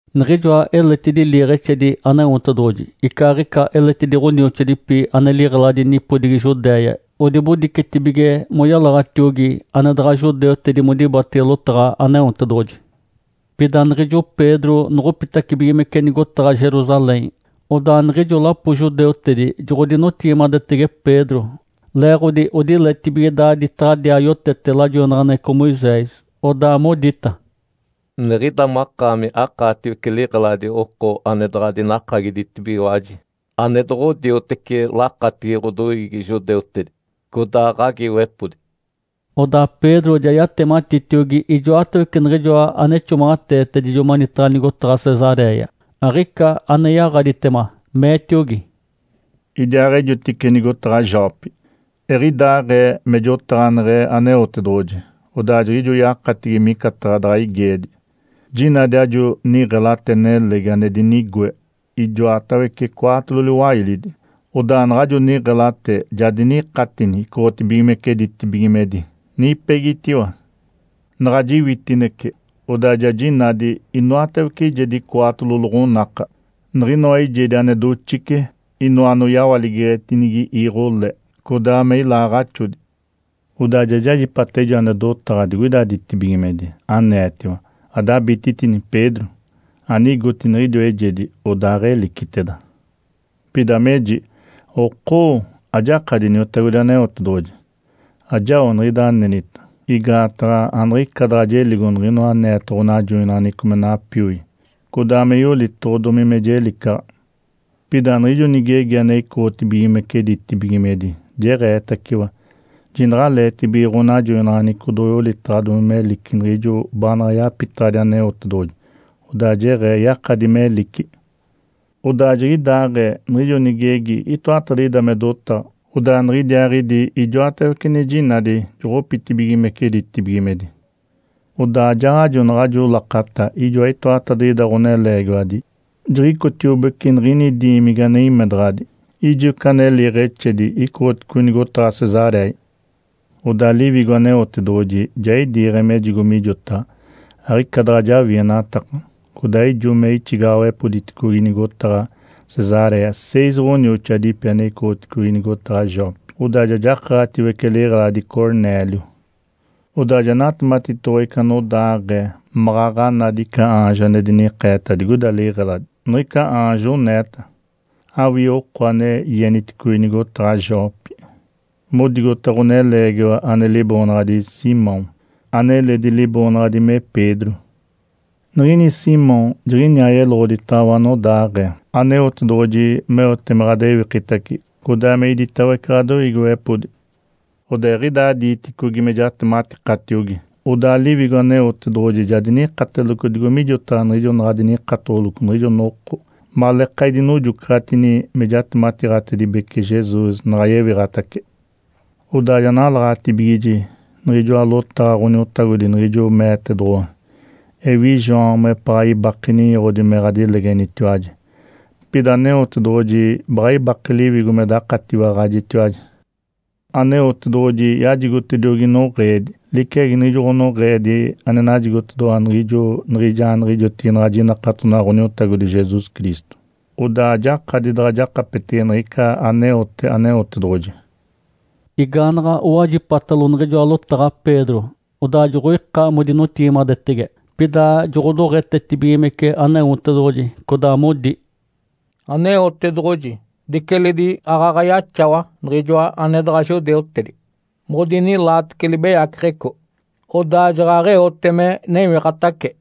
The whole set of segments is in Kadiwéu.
Niɡ̶ijoa eletidi liiɡ̶exedi Aneotedoɡ̶oji icaaɡ̶ica eledi ɡ̶onioxoadipi ane liɡ̶eladi nipodigi Judéia odibodicetibige moyalaɡ̶atiogi ane daɡ̶a judeutedi modibatege lotaɡ̶a Aneotedoɡ̶oji. Pida niɡ̶ijo Pedro noɡ̶opitacibigimece nigotaɡ̶a Jerusalém, odaa niɡ̶ijo lapo judeutedi joɡ̶odinotigimadetege Pedro, leeɡ̶odi odiletibige daaditaɡ̶adiaa yotete lajoinaɡ̶aneɡ̶eco Moisés. Odaa modita, “Niɡ̶ida makaami akaatiwece liɡ̶eladi oko ane daɡ̶a dinakagiditibigiwaji ane doɡ̶odioteci lakatigi ɡ̶odoiigi judeutedi, codaa ɡ̶agiiwepodi.” Odaa Pedro ja yatematitiogi ijoatawece niɡ̶ijoa ane ixomaɡ̶ateetedijo manitaɡ̶a nigotaɡ̶a Cesaréia, aɡ̶ica ane yaɡ̶aditema, meetiogi, “Idiaaɡ̶ejotice nigotaɡ̶a Jope, eɡ̶idaaɡ̶ee me jotaɡ̶aneɡ̶e Aneotedoɡ̶oji, odaa jiɡ̶ijo yakatigi micataɡ̶a daɡ̶a igeedi. Jinadi ajo niɡ̶elate nelegi ane dinigoe ijoatawece cwaatolo liwailidi. Odaa naɡ̶ajo niɡ̶elate ja dinikatini icoɡ̶otibigimece ditibigimedi, nipegitiwa. Naɡ̶a jiwitinece, odaa ja jinadi inoatawece eijedi cwaatolo loɡ̶onaka, niɡ̶inoa eijedi ane doxice, inoa ane oyawaligeɡ̶etinigi iiɡ̶o le, codaa me ilaaɡ̶axodi. Odaa ja jajipata ijo ane dotaɡ̶a digoida ditibigimedi, aneetiwa, ‘Adabititini, Pedro! Anigoti niɡ̶idiwa eijedi, odaaɡ̶eliciteda!’ Pida meji, ‘Okoo, ajakadi Iniotagodi Aneotedoɡ̶oji! Ajao niɡ̶ida anenita. Igaataɡ̶a aniɡ̶ica daɡ̶a jeligo niɡ̶inoa aneeta ɡ̶onajoinaɡ̶aneɡ̶eco me napioi, codaa me yolitoɡ̶odomi me jelicaɡ̶a.’ Pida niɡ̶ijo nigegi ane icoɡ̶otibigimece ditibigimedi jeɡ̶eetaciwa, ‘Jinaɡ̶aleetibige ɡ̶anajoinaɡ̶aneɡ̶eco doɡ̶oyolitaɡ̶adomi melici niɡ̶ijo baanaɡ̶a yapitaɡ̶adi Aneotedoɡ̶oji, odaa jeɡ̶ee yakadi melici.’ Odaa jiɡ̶idaaɡ̶ee, niɡ̶ijo nigegi itoatadiɡ̶ida me dotaɡ̶a, odaa niɡ̶idiaaɡ̶idi ijoatawece ane jinadi joɡ̶opitibigimece ditibigimedi. Odaa ajaaɡ̶ajo naɡ̶ajo lakata ijoa itoatadiɡ̶ida ɡ̶oneleegiwadi jiɡ̶icotiobece niɡ̶ini diimigi ane imedaɡ̶adi. Ijo ica ane liiɡ̶exedi icoɡ̶oticogi nigotaɡ̶a Cesaréia. Odaa Liwigo Aneotedoɡ̶oji ja idiiɡ̶e mejigo mijotaɡ̶a, aɡ̶ica daɡ̶a jawienataka. Codaa ijo me ixigaɡ̶awepoditicogi nigotaɡ̶a Cesaréia seis ɡ̶onioxoadipi ane icoɡ̶oticogi nigotaɡ̶a Jope, odaa ja jakaɡ̶atiwece liɡ̶eladi Cornélio. Odaa ja natematitoɡ̶owa ica anodaaɡ̶ee maɡ̶aɡ̶a nadi ica aanjo ane dinikeeta digoina liɡ̶eladi. Niɡ̶ica aanjo oneeta, ‘Awii oko ane ieniticogi nigotaɡ̶a Jope modigota ɡ̶oneleegiwa ane liboonaɡ̶adi Simão, aneledi liboonaɡ̶adi me Pedro. Niɡ̶ini Simão jiɡ̶iniaa yeloɡ̶oditaɡ̶awa anodaaɡ̶ee Aneotedoɡ̶oji meote me ɡ̶adewikitace codaa me iditawece ɡ̶adoiigiwepodi.’ Odaa eɡ̶idaa diiticogi me jatematikatiogi, odaa Liwigo Aneotedoɡ̶oji ja dinikateloco digo mijotaɡ̶a niɡ̶ijo naɡ̶a dinikatoɡ̶oloco niɡ̶ijo noko maleeka idinojocaɡ̶atini me jatematiiɡ̶atibece Jesus naɡ̶a yewiɡ̶atace. Odaa ja nalaɡ̶atibigiji niɡ̶ijoa lotaɡ̶a Ǥoniotagodi niɡ̶ijo meetedoɡ̶owa, ‘Ewi João mepaɡ̶a ibake ninyoɡ̶odi me ɡ̶adilegenitiwaji, pida Aneotedoɡ̶oji baɡ̶a ibake Liwigo me dakatiwaɡ̶ajitiwaji.’ Aneotedoɡ̶oji yajigotediogi noɡ̶eedi liciagi niɡ̶ijo ɡ̶onoɡ̶eedi ane najigotedoɡ̶owa niɡ̶ijo niɡ̶ijaaniɡ̶ijotigi naɡ̶a jinakatonaɡ̶a Ǥoniotagodi Jesus Cristo. Odaa ajakadi daɡ̶a jakapetege niɡ̶ica aneote Aneotedoɡ̶oji.” Igaanaɡ̶a owajipatalo niɡ̶ijoa lotaɡ̶a Pedro, odaa joɡ̶oika modinotigimadetege, pida joɡ̶odoɡ̶etetibigimece Aneotedoɡ̶oji, codaa modi, “Aneotedoɡ̶oji diceledi aaɡ̶aɡ̶a yaxawa niɡ̶ijoa ane daɡ̶a judeutedi modinilaatece libeyaceɡ̶eco, odaa jaɡ̶aɡ̶eote me newiɡ̶atace.”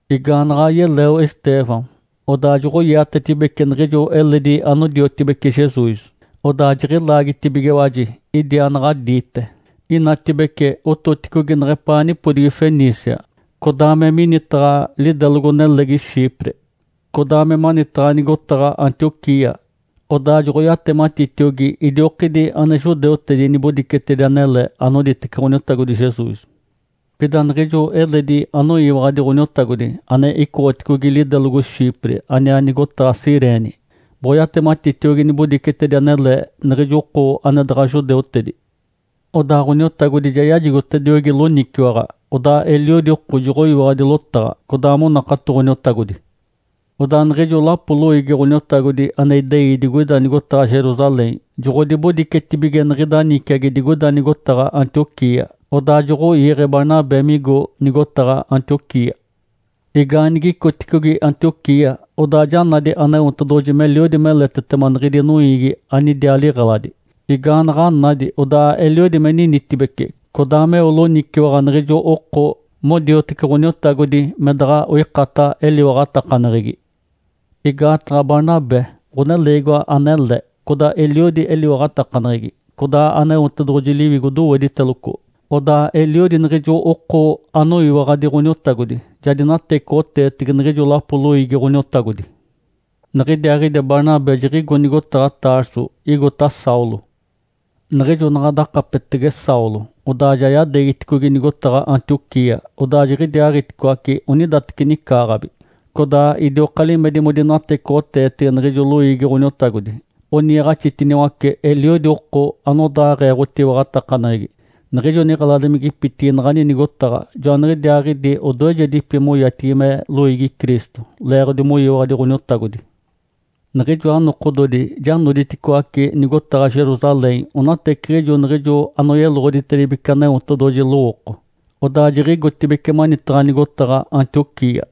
Igaanaɡ̶a yeleo Estêvão, odaa joɡ̶oiatetibeci niɡ̶ijo eledi anodiotibece Jesus, odaa jiɡ̶ilaagitibigiwaji idiaanaɡ̶adiite. Inatibece ototicogi neɡ̶epaa nipodigi Fenícia, codaa me minitaɡ̶a lidelogo-nelegi Chipre, codaa me manitaɡ̶a nigotaɡ̶a Antioquia. Odaa joɡ̶oyatematitiogi idiokidi ane judeutedi nibodicetedi anele anoditece Ǥoniotagodi Jesus. Pida niɡ̶ijo eledi anoyiwaɡ̶adi Ǥoniotagodi ane icoɡ̶oticogi lidelogo Chipre aniaa nigotaɡ̶a Cirene boɡ̶oyatematitiogi nibodicetedi anele niɡ̶ijo oko ane daɡ̶a judeutedi. Odaa Ǥoniotagodi ja yajigotediogi loniciwaɡ̶a, odaa eliodi oko joɡ̶oyiwaɡ̶adi lotaɡ̶a, codaa monakato Ǥoniotagodi. Odaa niɡ̶ijo lapo loiigi Ǥoniotagodi ane idei digoida nigotaɡ̶a Jerusalém joɡ̶odibodicetibige niɡ̶ida niciagi digoida nigotaɡ̶a Antioquia. Odaa joɡ̶oiiɡ̶e Barnabé migo nigotaɡ̶a Antioquia. Igaaniɡ̶icoticogi Antioquia, odaa ja nadi Aneotedoɡ̶oji meliodi meletetema niɡ̶idi noiigi anidiaa liɡ̶eladi. Igaanaɡ̶a nadi, odaa eliodi me ninitibece codaa meo loniciwaɡ̶a niɡ̶ijo oko modiotece Ǥoniotagodi me daɡ̶a oikata eliwaɡ̶atakaneɡ̶egi. Igaataɡ̶a Barnabé ɡ̶oneleegiwa anele, codaa eliodi eliwaɡ̶atakaneɡ̶egi, codaa Aneotedoɡ̶oji Liwigo dowediteloco. Odaa eliodi niɡ̶ijo oko anoyiwaɡ̶adi Ǥoniotagodi ja dinatecoɡ̶oteetege niɡ̶ijo lapo loiigi Ǥoniotagodi. Niɡ̶idiaaɡ̶idi Barnabé jiɡ̶igo nigotaɡ̶a Tarso igota Saulo. Niɡ̶ijo naɡ̶a dakapetege Saulo, odaa ja yadeegiticogi nigotaɡ̶a Antioquia. Odaa jiɡ̶idiaaɡ̶iticoace onidateci nicaaɡ̶abi, codaa idioka limedi modinatecoɡ̶oteetege niɡ̶ijo loiigi Ǥoniotagodi, oniiɡ̶axitiniwace eliodi oko anodaaɡ̶ee ɡ̶otiwaɡ̶atakaneɡ̶egi. Niɡ̶ijo niɡ̶eladimigipitigi naɡ̶ani nigotaɡ̶a joaniɡ̶idiaaɡ̶idi odoejedipi moyatigi me “Loiigi Cristo” leeɡ̶odi moyiwaɡ̶adi Ǥoniotagodi. Niɡ̶ijoa nokododi ja noditicoaci nigotaɡ̶a Jerusalém onateciɡ̶ijo niɡ̶ijo anoyeloɡ̶oditedibece Aneotedoɡ̶oji lowooko, odaa jiɡ̶igotibeci manitaɡ̶a nigotaɡ̶a Antioquia.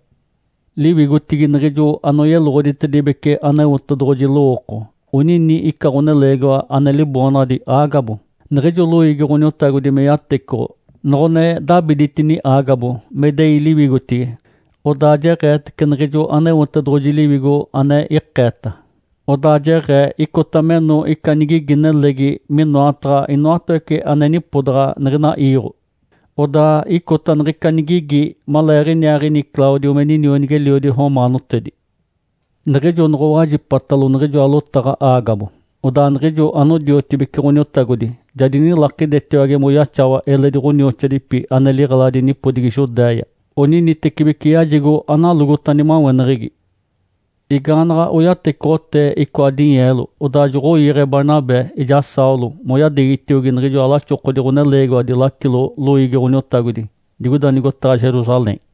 Liwigotigi niɡ̶ijo anoyeloɡ̶oditedibece Aneotedoɡ̶oji lowooko onini ica ɡ̶oneleegiwa ane liboonaɡ̶adi Ágabo. Niɡ̶ijo loiigi Ǥoniotagodi me yatecoɡ̶o, noɡ̶one dabiditini Ágabo me idei liwigotigi, odaa jeɡ̶eetece niɡ̶ijo Aneotedoɡ̶oji Liwigo ane ikeeta. Odaa jeɡ̶ee icota meno ica nigigi nelegi minoataɡ̶a inoatawece ane nipodaɡ̶a niɡ̶ina iiɡ̶o. Odaa icota niɡ̶ica nigigi maleeɡ̶iniaaɡ̶ini Cláudio me ninionigi-eliodi romaanotedi. Niɡ̶ijo noɡ̶owajipatalo niɡ̶ijoa lotaɡ̶a Ágabo, odaa niɡ̶ijo anodiotibece Ǥoniotagodi ja dinilakidetiwage moyaxawa eledi ɡ̶onioxoadipi ane liɡ̶eladi nipodigi Judéia. Oninitecibeci yajigo analogota nimaweneɡ̶egi. Igaanaɡ̶a oyatecoɡ̶otee icoa dinyeelo, odaa joɡ̶oiiɡ̶e Barnabé ijaa Saulo moyadeegitiogi niɡ̶ijoa laxokodi ɡ̶oneleegiwadi lacilodi loiigi Ǥoniotagodi digoida nigotaɡ̶a Jerusalém.